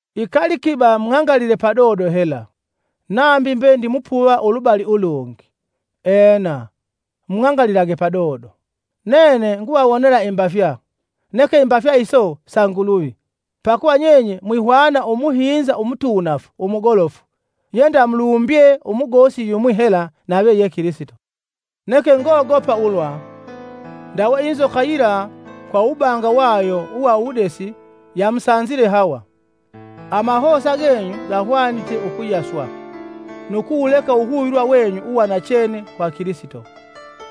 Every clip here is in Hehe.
Ikali kiba mung'angalile padodo hela, nambi mbe ndimupuva ulubali ulungi! Ena, mung'angalilage padodo. Nene nguvawonela imbafya neke imbafya iso sa Nguluvi; pakuva nyenye mwihwana umuhinza umutuunafu umugolofu yendamulumbye umugosi yumwi hela nave ye Kilisito. Neke ngogopa ulwa, ndawe inzoka yila kwa uwubanga wayo uwa uwudesi yamusanzile Hawa, amahosa genyu gahwanite ukuyaswa, nu kuwuleka uwuhuvilwa wenyu uwa nachene kwa Kilisito.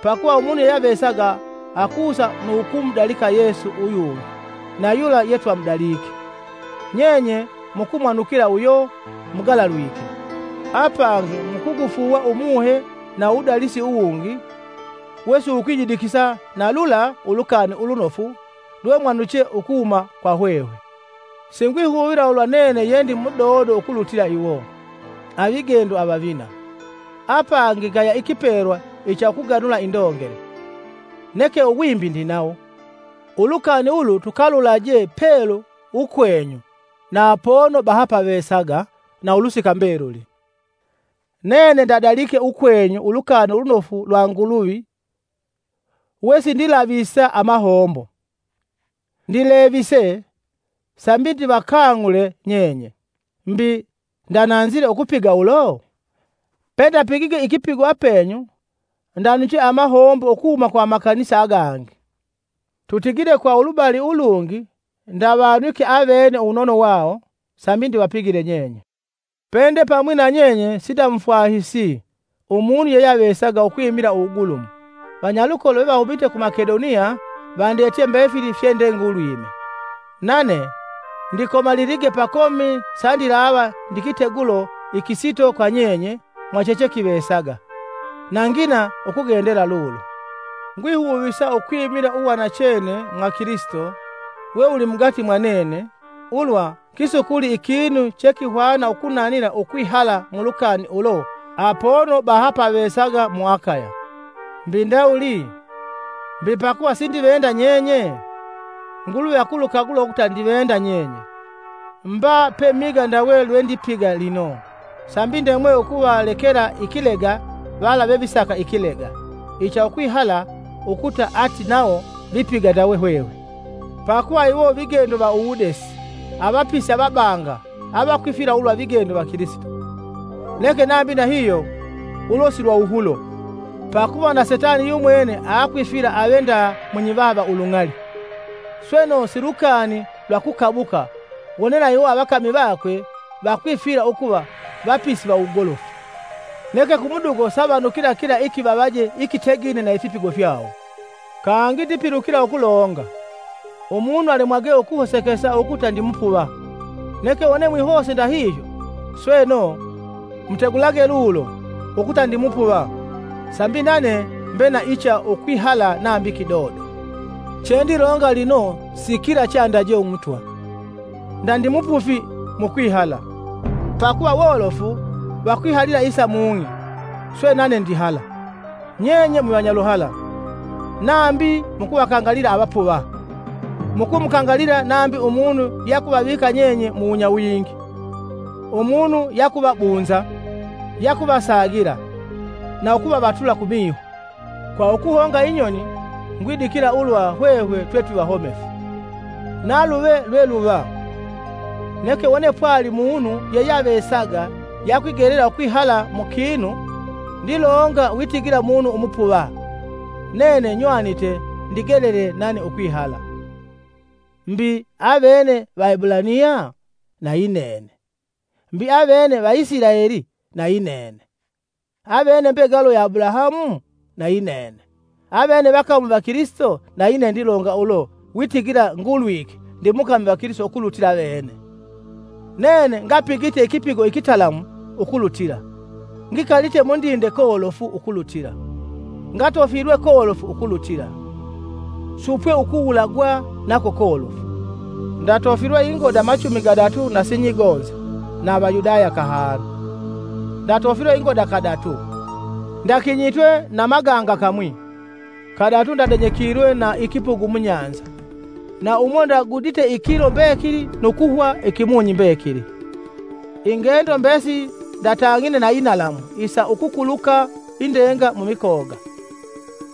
Pakuva umunu yeyeavesaga akusa nu ukumudalika Yesu uyungi na yula yetwamudalike, nyenye mukumwanukila uyo mugalalwike, apangi mukugufuuwa umuhe na uwudalisi uwungi wesiwukwiyidikisa na lula Ulukani Ulunofu lwemwanuche ukuhuma kwa hwehwe. Singwihuvila ulwa nene ye ndi mudodo ukulutila iwo, “Avigendo avavina.” Apangi ngaya ikipelwa icha ukuganula indongele, neke uwimbi ndinawo; ulukani ulu tukalulaje pelu ukwenyu na apono pepepavesaga na ulusika mbeluli. Nene ndadalike ukwenyu Ulukani Ulunofu lwa Nguluvi wesindilavisa amahombo; ndileviise sambi ndivakang'ule nyenye. Mbi, ndananzile ukupiga ulo? Pendapigige ikipigo apenyu, ndanuche amahombo ukuhuma kwa amakanisa agangi. Tutigile kwa ulubali ulungi ndavanwike avene uwunono wawo sambi ndivapigile nyenye. Pende pamwi na nyenye sindamufwahisi, umunu yeyeavesaga ukwimila uwugulumu, vanyalukolo vevahumite ku Makedoniya vandetye mbefili fye ndengulwime. Nane ndikomalilige pakomi sandilava ndi kitegulo ikisito kwa nyenye mwa chechekivesaga, na ngina ukugendela lulo. Ngwihuvisa ukwimila uwa nachene mwa Kilisito we wuli mugati mwa nene, ulwa kisukuli ikinu chekihwana ukunanila ukwihala mulukani ulo apono baha pavesaga mu Akaya. Mbi ndawuli? Mbi pakuva sindivenda nyenye? Nguluvi akulukagula ukuta ndivenda nyenye! Mba pemiga ndawe lwe ndipiga lino, sambi ndemwe ukuvalekela ikilega vala vevisaka ikilega, icha ukwihala ukuta ati nawo vipiga ndawe hwehwe. Pakuva, iwo vigendo va uwudesi, avapisi avabanga avakwifwila ulwa vigendo va Kilisito. Neke nambi ndahihyo ulo silwa wuhulo, pakuva na Setani yumwene aakwifwila ave nda munyivaha va ulung'ali! Sweno si lukani lwa kukabuka wone na iwo avakami vakwe vakwifwila ukuva vapisi va uwugolofu. Neke kumudugo savanukila kila ikivavaje ikitegine na ifipigo fyawo. Kangi ndipilukila ukulonga: Umunu alemwage ukuhosekesa ukuta ndimupuva. Neke wone mwihose ndahihyo, sweno, mutegulage lulo ukuta ndimupuva sambi nane mbe na icha ukwihala nambi kidodo. Chendilonga lino si kila cheandaje Umutwa; nda ndimupufi mukwihala, pakuva wolofu vakwihalila isa mung'i, swe nane ndihala. Nyenye mwivanyaluhala, nambi mukuvakangalila avapuva! Mukumukangalila nambi umunu yakuvavika nyenye muwunyawingi, umunu yakuvabunza, yakuvasagila, na ukuvavatula kumiho! Kwa ukuhonga inyoni ngwidikila ulwa hwehwe twetwivahomefu. Naluve lweluva, neke wone pwali munu yeyeyavesaga yakwigelela ukwihala mu kinu—ndilonga witigila munu umupuva—nene nywanite ndigelele nane ukwihala. Mbi, avene Vaebulaniya? Na yinene. Mbi avene Vaisilaeli? Na yinene. Avene mbegalo ya Abulahamu? Na yinene. Avene vakami va Kilisito? Na yinene ndilonga ulo witigila ngulwike ndi mukami va Kilisito ukulutila avene. Nene ngapigite ikipigo ikitalamu ukulutila, ngikalite mundinde kolofu ukulutila, ngatofilwe kolofu ukulutila, supwe ukuwulagwa nako kolofu. Ndatofilwe ingoda machumi gadatu na sinyigonza na Avayudaya kahanu. Ndatofilwe ingoda kadatu, ndakinyitwe na maganga kamwi; kadatu ndadenyekilwe na ikipugu mubahali, na umo ndagudite ikilo mbekili nu kuhwa ikimunyi mbekili. Ingendo mbesili ndatang'ine na inalamu isa ukukuluka indenga mumikoga,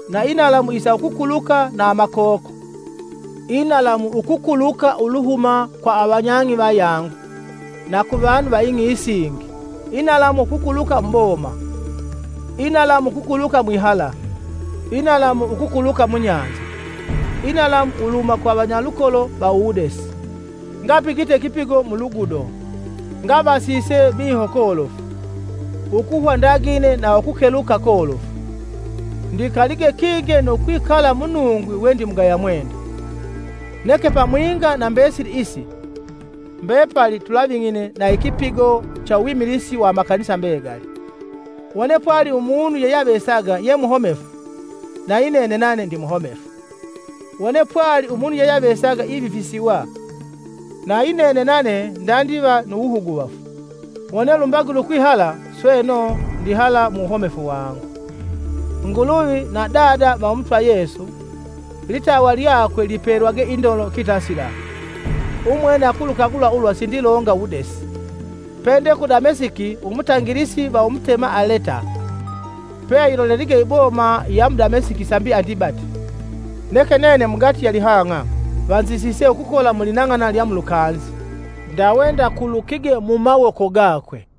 na inalamu isa ukukuluka na amakoko, inalamu ukukuluka uluhuma kwa avanyang'i vayangu na kuvanu va ing'i isingi, inalamu ukukuluka muboma; inalamu ukukuluka mwihala, inalamu ukukuluka mu bahali, inalamu uluhuma kwa vanyalukolo va uwudesi! Ngapigite ikipigo mu lugudo, ngavasise miho kolofu; ukuhwa ndagine na kukeluka kolofu; ndikalige kinge nu kwikala munungwi we ndimugaya mwenda. Neke pamwinga na mbesili isi, mbepali tulaving'ine na ikipigo cha uwimilisi wa amakanisa mbegali. Wone pwali umunu yeyeavesaga ye muhomefu, na yinene nane ndimuhomefu; wone pwali umunu yeyeavesaga ivifisiwa, nayinene nane ndandiva nu wuhuguvafu. Wone lumbagile ukwihala, sweno, ndihala mu wuhomefu wangu. Nguluvi na Dada va Umutwa Yesu—litawa lyakwe lipelwage indolo kitasila—umwene akulukagula ulwa sindilonga wudesi. Pende ku Damesiki umutangilisi va Umutema Aleta, peayilolelige iboma ya mu Damesiki sambi andibate. Neke nene mugati ya lihanga vanzisise ukukola mulinang'ana lya mulukanzi, ndave ndakulukige mumawoka gakwe.